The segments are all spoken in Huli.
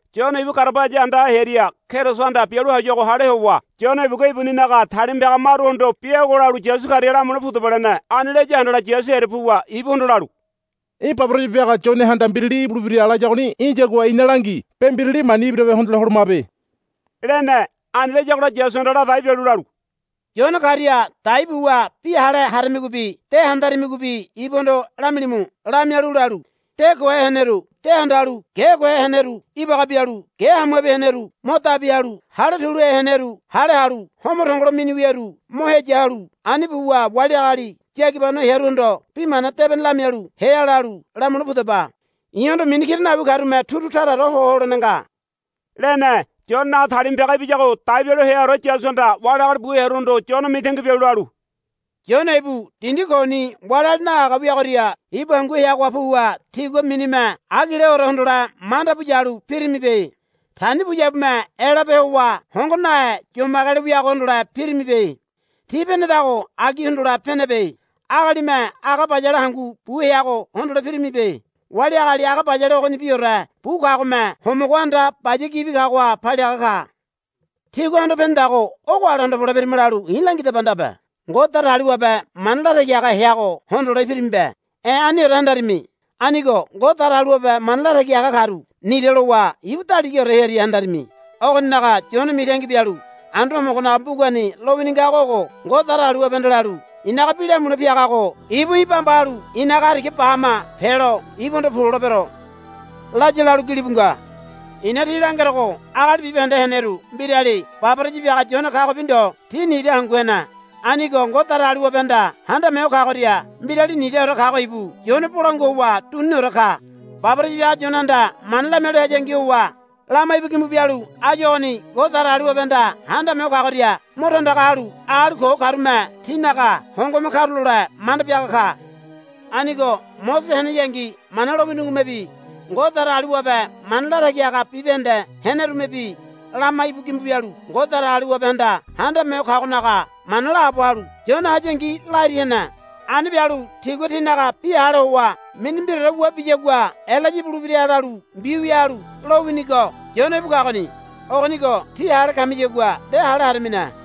Yone ibu garabaya andaha hearia Kerisohanda bialu hayuago hale howa Yone ibugua ibuninaga talima piaga maruhondo, Bi agua lalu Yasu karia lamule pudaba, lene. Ani laya handala Yasu hearia puwa ibuhondo lalu, Í̠ baboraya biaga Yonehanda, Mbirali ibulebira, layagoni í̠yagua ina langi. Be mbirali mani ibirabe hondole holomabe, lene. Ani layagola Yasuhanda la dai bialu lalu, Yone karia dai buwa bi hale haramigobi de handaramigobi ibuhondo lamilimu. Lamialu lalu, De kohe heneru de handalu ge kohe heneru ibaga bialu ge hamuabi heneru mo dabi halu hale tuluhe heneru hale halu homo tongolo mini wiaru mo heya ho helalu ani buwa wali agali yagibano hearuhondo Bi Mana Debene lamialu hea, lalu lamule pudaba. I̱hondo mini kira nawi karume turu taraore ho holene nga, lene. Yonenaga talima piaga ibiyago dai bialu heaore Yasuhanda wali agali bu hearuhondo Yone mitangi bialu lalu, Yone ibu dindi koni wali agali nahaga wiagoria ibu hangu heagoha puwa tígua minime agileore hondole manda bu yalu pirimibe. Tani puyabume elape howa hongo nahe yomagelo wiago hondole pirimibe. Tí penedago agi hondole penebe. Agalime aga bayale hangu bu heago hondole pirimibe. Wali agali aga bayale ogonibiore bu kagome homogo anda baya gibi kagoha paliaga ka. Tígua hondo penedago ogo ale hondole pirima lalu i̱ langidaba ndabe. Ngode Datagaliwabe mana latagi haga heago hondole pirimibe. E̱ aniore handarimi. Anigo Ngode Datagaliwabe mana latagi haga karu nira lowa ibu daligaore hearia handarimi. Ogoninaga Yone mitangi bialu Anduane Homogonaga mbugani lowini ngago ogo, Ngode Datagaliwabehanda lalu, I̱naga bi lamule piagago ibu í̠ bamba halu í̠naga hariga ba hama pelo ibuhondo pu lolebero, laya, lalu gilibu nga. I̱na tí langerogo agali bibahende heneru mbirali baboraya biaga Yone kagobi ndo ti nira hangu hene. Anigo Ngode Datagaliwabehanda Handame Ho Kagoria mbirali niraore kago ibu Yone bolangua howa duniniore ka. Baboraya biaga Yonehanda mana lamialu hayangi howa lama íbu gimbu bialu áyu ogoni Ngode Datagaliwabehanda Handame Ho Kagoria mo tandaga halu agali ko karume tinaga hongome karulole manda biaga ka. Anigo Mosese heneyangi Mana lowinigomebi Ngode Datagaliwabe mana latagi haga bibahende henerumebi lama íbu gimbu bialu Ngode Datagaliwabehanda Handame Ho Kagonaga mana laabo halu Yone hayangi lairi hene. Ani bialu tígua tinaga bi hale howa mini mbiraore wua biyagua Elaya ibulebira lalu mbiwia halu lowinigo Yone íbu kagoni. Ogonigo tí hale kamiyagua nde hale haramine.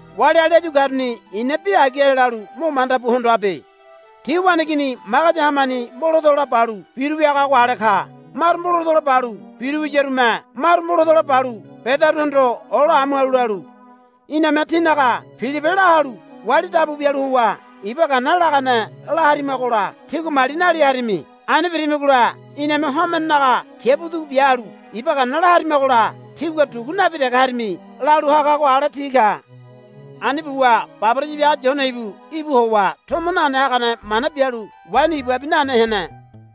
Wali agali áyu karuni i̱na bi agi ale lalu mo manda bu hondoabe. Ti waneigini magadi hamani mbolatola balu biru wiagago ale ka. Maru mbolatola balu bira wiyarume maru mbolatola balu bedaruhondo ola amu halu lalu, Iname tínaga pilipe la halu wali dabu bialu howa iba gana lagane la harimagola tígua mali nali harimi. Ani birimigola iname homenenaga kiabu dugu bia halu iba gana la harimagola tígua dugu nabi dege harimi, lalu hagago ale ti ka. Ani buwa baboraya biaga Yone ibu íbu howa tomo nane hagane mana bialu waini ibabi nane hene.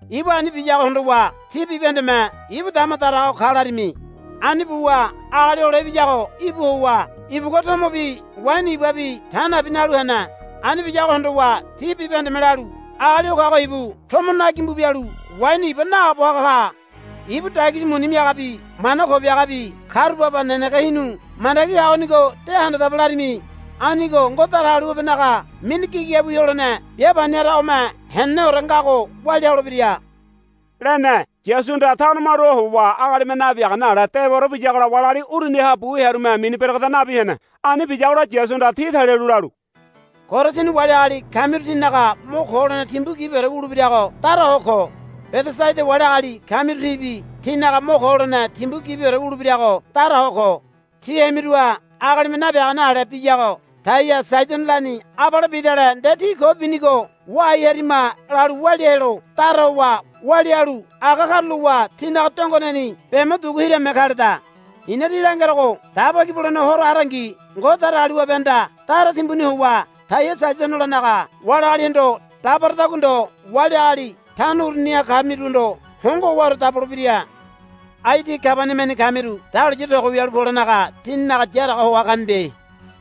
Ibu ani biyago hondowa tí bibahendeme, Ibu dama daraga ho ka, larimi. Ani buwa Agali Hole Ibiyago íbu howa ibugua tomobi waini ibabi ta nabi nalu hene. Ani biyago hondowa tí bibahendeme lalu, Agali o kago ibu tomo na gimbu bialu waini iba naabo haga ka. Ibu dagisi muni miagabi mana ko biagabi karu baba nenege hinu mandagi kagonigo de handadaba, larimi. Anigo Ngode Datagaliwabenaga mini gigabiwi holene bia pani haragome heneneore ngago walia holebira, lene. Yasuhanda tano maruha howa agalime nabiagane ale dewaore biyagola wali agali uruniha bu hearume mini beregeda nabi hene. Ani biyagola Yasuhanda ti talialu lalu, Korasini wali agali kamiru tínaga mo ko holene timbu gibiore wulebirago dara ho ko. Bedesaida wali agali kamirubi tínaga mo ko holene timbu gibiore wulebirago dara ho ko. Tí hemiruha agalime nabiagane ale biyago Taia Saidonolani abale bidale nde ti ko binigo wahai harima lalu walia helo dara howa walia halu aga karulowa tinaga dongoneni be mo dugu hirame kaleda. I̱na tí langerogo Daba Ki Bulene Horo harangi Ngode Datagaliwabehanda dara timbuni howa Taia Saidonolanaga wali agalihondo dabaradagua ndo wali agali tano uruniha kamiruhondo hongo howaore dabolebira. Ai tí Kabaniamani kamiru dahuliya togo wialu polenaga tíninaga yaraga hoa kamibe.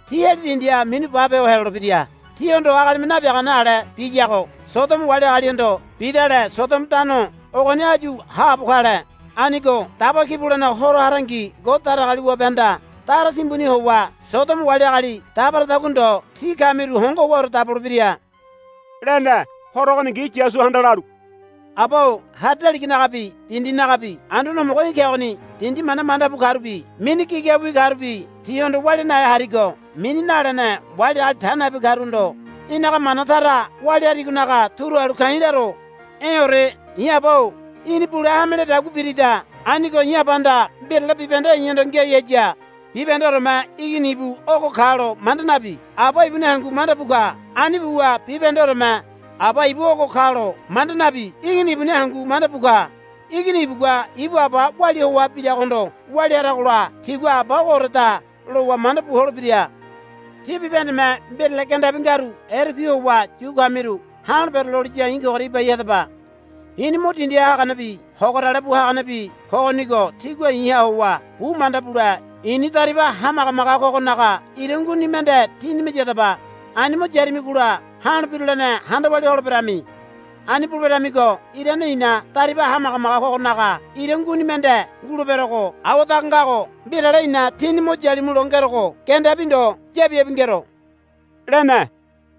Tí heli dindiha minu bape ho helolebira. Tíhondo agalime nabiagane ale biyago Sodomo wali agalihondo bidale Sodomo tano ogoni áyu haabo kale. Anigo Daba Ki Bulene Horo harangi Ngode Datagaliwabehanda dara timbuni howa Sodomo wali agali dabaradagua ndo tí kamiru hongo howaore dabolebira, lene. Horo ogoningi Yasuhanda lalu, Aba-o hari daliganagabi dindinagabi Anduane Homogo í̠ kegoni. Dindi mana manda bu karubi mini gigabiwi karubi tihondo walia nahe harigo mini nalene wali agali ta nabi karuhondo í̠naga mana tara walia harigonaga turu halu ka̱i̱ laro. E̱ore. I̱ Aba-o í̠ni bule hame lededagua birida. Anigo í̠ Abahanda mbirale bibahende i̱hondo ngiai haya. Bibahendeoreme Igini ibu ogo kalo manda nabi Aba ibuni hangu manda bu ka. Ani buwa bibahendeoreme Aba ibu ogo kalo manda nabi Igini ibuni hangu manda bu ka. Igini ibugua ibu Aba walia hoa biragohondo walia haragola tigua Aba ogooreda lowa manda bu holebira. Tí bibahendeme mbirale gendabi ngaru erekui howa yu kamiru ha̱lo̱ bereloliya i̱ kogoria ibai hadaba. I̱ni mo dindiha haganebi hogorale bu haganebi kogonigo tígua i̱ha howa bu manda bule i̱ni dariba hamagamaga kogonaga ira nguini mende tínime yadaba. Ani mo yaramigola ha̱lo birulene handa walia holeberami. Ani buleberamigo irane i̱na dariba hamagamaga kogonaga ira nguini mende nguleberogo awadaga ngago mbirale i̱na tíni mo yalimulo ngerogo gendabi ndo yabiabi ngero, lene.